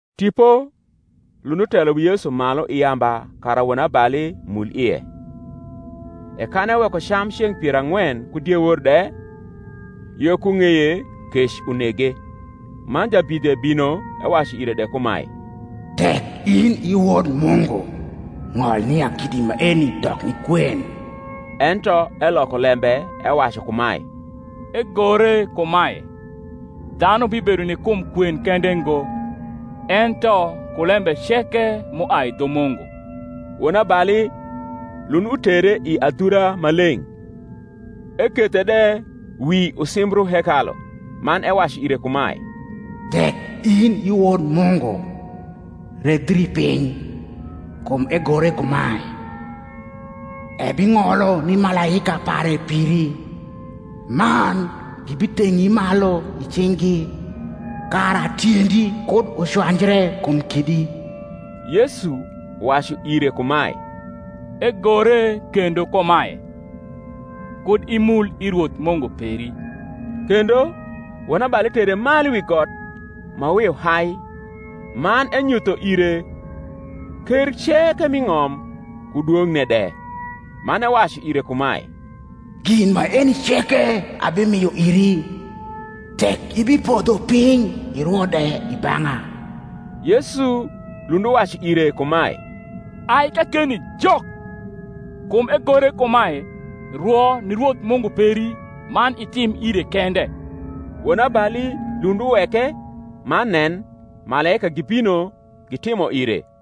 Tipo lund utelo wi Yesu malu i yamba kara wonabali mul ie. E kan eweko cam ceng’ pier ang’wen ku diewor de, yo ku ng’eye kec unege. Man jabidhe bino ewacu ire de kumae, Tek in i Wod Mungu, ng’ol nia kidi maeni dok ni kwen. Ento eloko lembe ewacu kumae, Egore kumae, Dhanu bibedo ni kum kwen kende ngo, ento ku lembe ceke m’uai dhu Mungu. Wonabali lund utere i adhura ma leng’; ekethe de wi usimbru hekalu, man ewacu ire kumae, Tek in i Wod Mungu, redhri piny: kum egore kumae, Ebing’olo ni malaika pare piri: man, Gibitheng’i malu i cing’gi, Kara tiendi kud ucwanjre kum kidi. Yesu wacu ire kumae, Egore kendo kumae, Kud imul i Rwoth Mungu peri. Kendo, wonabali tere malu wi got ma wiu hai, man enyutho ire ker ceke m’i ng’om, ku dwong’ne de; man ewacu ire kumae, Gin maeni ceke abimio iri, tek ibipodho piny irwo de i bang’a. Yesu lund uwacu ire kumae, Ai kakeni, Jok: kum egore kumae, Rwo ni Rwoth Mungu peri, man itim ire kende. Wonabali lund uweke; man nen, malaika gibino gitimo ire.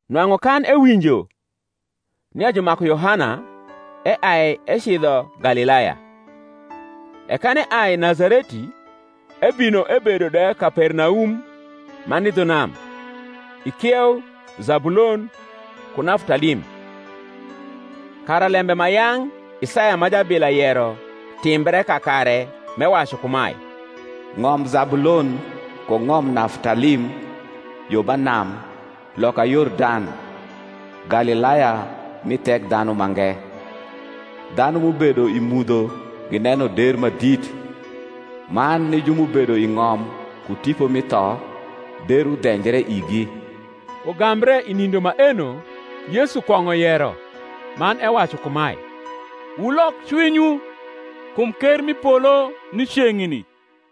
Nwang’u kan ewinjo nia jumaku Yohana, eai ecidho Galilaya; e kan eai Nazareti, ebino ebedo de Kapernaum, ma ni dhu nam, i kieu Zabulon ku Naftalim: kara lembe ma yang’ Isaya ma jabila yero timbre kakare, m’ewacu kumae, Ng’om Zabulon ku ng’om Naftalim, Yo ba nam, loka Yordan, Galilaya mi Thekdhanumange. Dhanu m’ubedo i mudho Gineno der ma dit, Man ni ju m’ubedo i ng’om ku tipo mi tho, Der udhenjre igi. Ugambre i nindo maeno Yesu kwong’o yero, man ewacu kumae Wulok cwinywu; kum ker mi polo ni ceng’ni.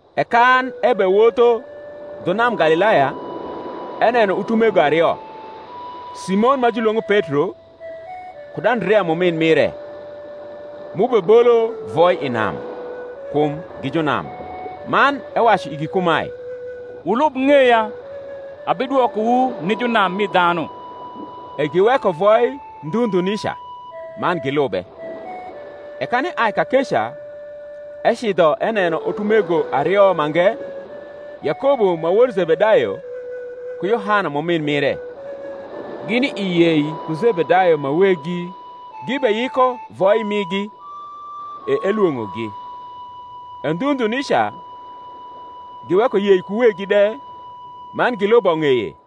E kan ebewotho dhu nam Galilaya, eneno utumego ario, Simon ma julwong’o Petro, kud Andrea m’umin mire, m’ubebolo voi i nam; kum gi junam. Man ewacu igi kumae, Wulub ng’eya, abidwokowu ni junam mi dhanu. E giweko voi ndhu ndhu nica, man gilube. E kan eai kakeca ecidho eneno utumego ario mange, Yakobo ma wod Zebedayo, ku Yohana m’umin mire, gini i yei ku Zebedayo ma weggi, gibeyiko voi migi; e elwong’ogi. E ndhu ndhu nica giweko yei ku weggi de, man gilubo ng’eye.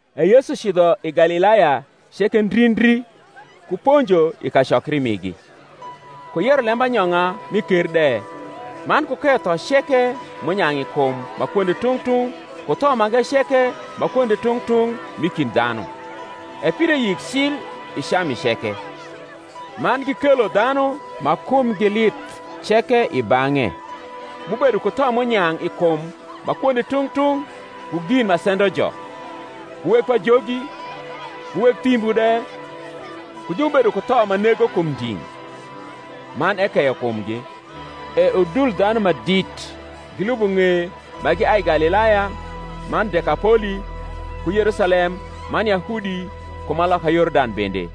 E Yesu cidho i Galilaya ceke ndri ndri, ku ponjo i kacokri migi, ku yero lembanyong’a mi ker de, man ku keyo tho ceke m’unyang’ i kum ma kwonde tung’ tung’ ku tho mange ceke ma kwonde tung’ tung’ m’i kind dhanu. E pire yik cil i Cami ceke: man gikelo dhanu ma kumgi lith ceke i bang’e, m’ubedo ku tho m’unyang’ i kum ma kwonde tung’ tung’ ku gin ma sendojo, ku weg pajogi, ku weg thimbu de, ku ju m’ubedo ku tho ma nego kum nding’; man ekeyo kumgi. E udul dhanu ma dit gilubo ng’eye ma giai Galilaya man Dekapoli ku Yerusalem man Yahudi ku ma loka Yordan bende.